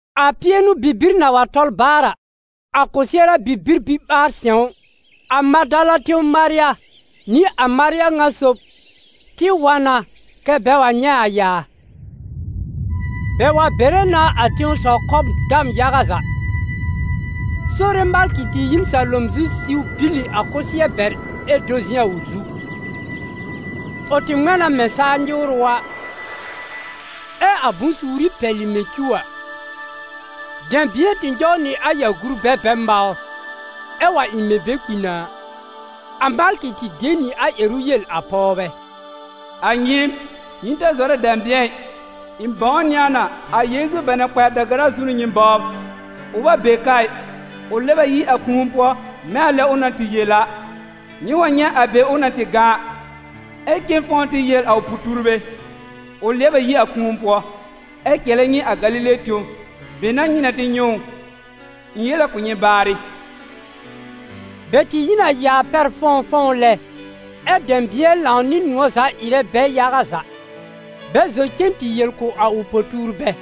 A pɩɛnʋ-bibir na wa tɔl baar a, a kɔsɩɛra bibir biɓaar-sɛ̃w, a Madala tẽw Marya nɩ a Marya ŋa sob tɩ wa na kɛ́ bɛ wa nyɛ̃ a yaa. Bɛ wa bere na a tẽsɔw kɔbr dam yaga za; Sore malkɩ tɩ yi n salom zu siw bìlì a kʋsɩɛr bɛr ɛ do zɩ̃ a ʋ zu. Ʋ tɩ ŋmɛ̃ na mɛ̃ saa nyɩwrʋ a, ɛ a bʋ̃-suuri pɛlɩ mɛ̃ cuw a. Dɛ̃bɩ̃ɛ tɩ nyɔw nɩ a yaa gurbɛ bɛ mawr, ɛ wa ɩ mɛ̃ bɛ kpi na a. A malkɩ tɩ de nɩ a ƴɛrʋ yel a pɔwbɛ: «A nyɩɩm, nyɩ ta zɔrɛ dɛ̃bɩ̃ɛ ɩ. Ɩ̃ bãwnɩ a na, a Yeezu bɛ na kpa a da-gara zu a n'ʋ nyɩ bɔbr. Ʋ bɛ be ka ɩ, ʋ lɛb a yi a kũu pʋɔ mɛ̃ a lɛ ʋ na tɩ yel a, nyɩ wa nyɛ̃ a be ʋ na tɩ gã a, ɛ cen fɔ̃w tɩ yel a ʋ po-tuurbɛ: ‹Ʋ lɛb a yi a kũu pʋɔ, ɛ cɛlɛ nyɩ a Galile tẽw, be n'a nyɩ na nyɛ̃ ʋ.› Ɩ̃ yel a kʋ̀ nyɩ baarɩ.» Bɛ tɩ yi n a yaa pɛr fɔ̃wfɔ̃w lɛ, ɛ́ dɛ̃bɩ̃ɛ lãw nɩ nʋ̃ɔ̀ za ɩrɛ bɛ yaga za, bɛ zɔ cen tɩ yel kʋ̀ a ʋ po-tuurbɛ.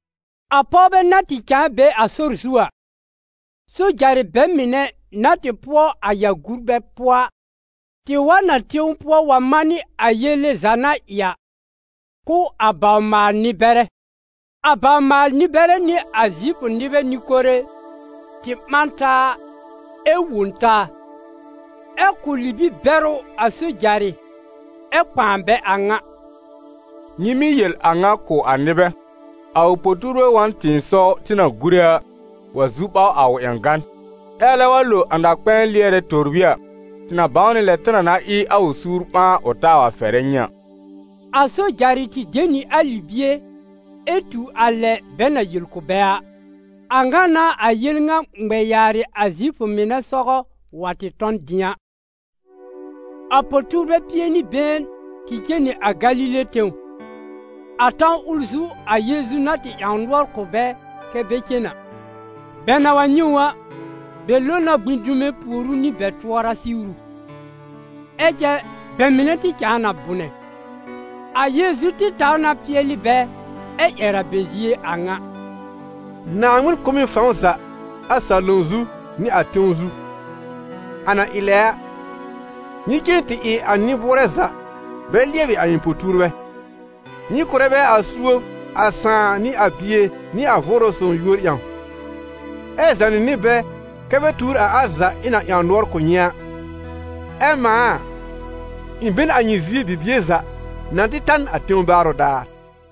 A pɔwbɛ na tɩ cãa be a sɔr zu a, sojarɩ bɛ mɩnɛ na tɩ pʋɔ a yaa gurbɛ pʋɔ a, tɩ wa n a tẽw pʋɔ wa manɩ a yele za na ɩ a, kʋ̀ a bawr-maal-nɩ-bɛrɛ. A bawr-maal-nɩ-bɛrɛ nɩ a Zifʋ nɩbɛ nɩ-kore tɩ ɓã n taa ɛ wõ taa, ɛ kʋ̀ libi-bɛrʋ a sojarɩ ɛ kpãa bɛ a ŋa: «Nyɩ mɩ́ yel a ŋa kʋ̀ a nɩbɛ: ‹A ʋ po-tuurbɛ wa n tɩ̃ɩsɔw tɩ na gúre a, wa zu ɓaw a ʋ ƴãgan.› Ɛ alɛ wa lo a na-kpɛ̃ɛ lɩɛrɛ tòbrí a, tɩ na bãw nɩ lɛ tɩ na na ɩ a ʋ suur ɓãa, ʋ taa wa fɛrɛ nyɩ a.» A sojarɩ tɩ de nɩ a libie ɛ tu a lɛ bɛ na yel kʋ̀ bɛ a. A ŋa n'a a yel ŋa ŋmɛ yaarɩ a Zifʋ mɩnɛ sɔgɔ wa tɩ tɔ n dɩ̃a. A po-tuurbɛ pie nɩ been tɩ cen nɩ a Galile tẽw, a tãw ʋl zu a Yeezu na tɩ ƴãw nʋɔr kʋ̀ bɛ kɛ́ bɛ cen a. Bɛ na wa nyɛ̃ ʋ a, bɛ lo na gbĩ dume pùor ʋ nɩ bɛ tʋɔra siwru, ɛ cɛ bɛ mɩnɛ tɩ cãa na bʋnɛ. A Yeezu tɩ taw na pɩɛlɩ bɛ ɛ ƴɛr a bɛ zie a ŋa: «Naaŋmɩn kʋ̀ m ɩ fãw za a salom zu nɩ a tẽw zu. A na ɩ lɛ a, nyɩ cen tɩ ɩ a nɩ-bʋʋrɛ za bɛ lɩɛbɩ a ɩ̃ po-tuurbɛ, nyɩ kʋ̀rɛ bɛ a suob a Sãà nɩ a Bie nɩ a Vʋʋrʋ Sõw yúor ƴãw, ɛ zànɩ nɩ bɛ bɛ tuur a al za ɩ̃ na ƴãw nʋɔr kʋ̀ nyɩ a. Ɛ mãa a, ɩ̃ be n a nyɩ zie bibie za na tɩ ta n a tẽw baarʋ daar.»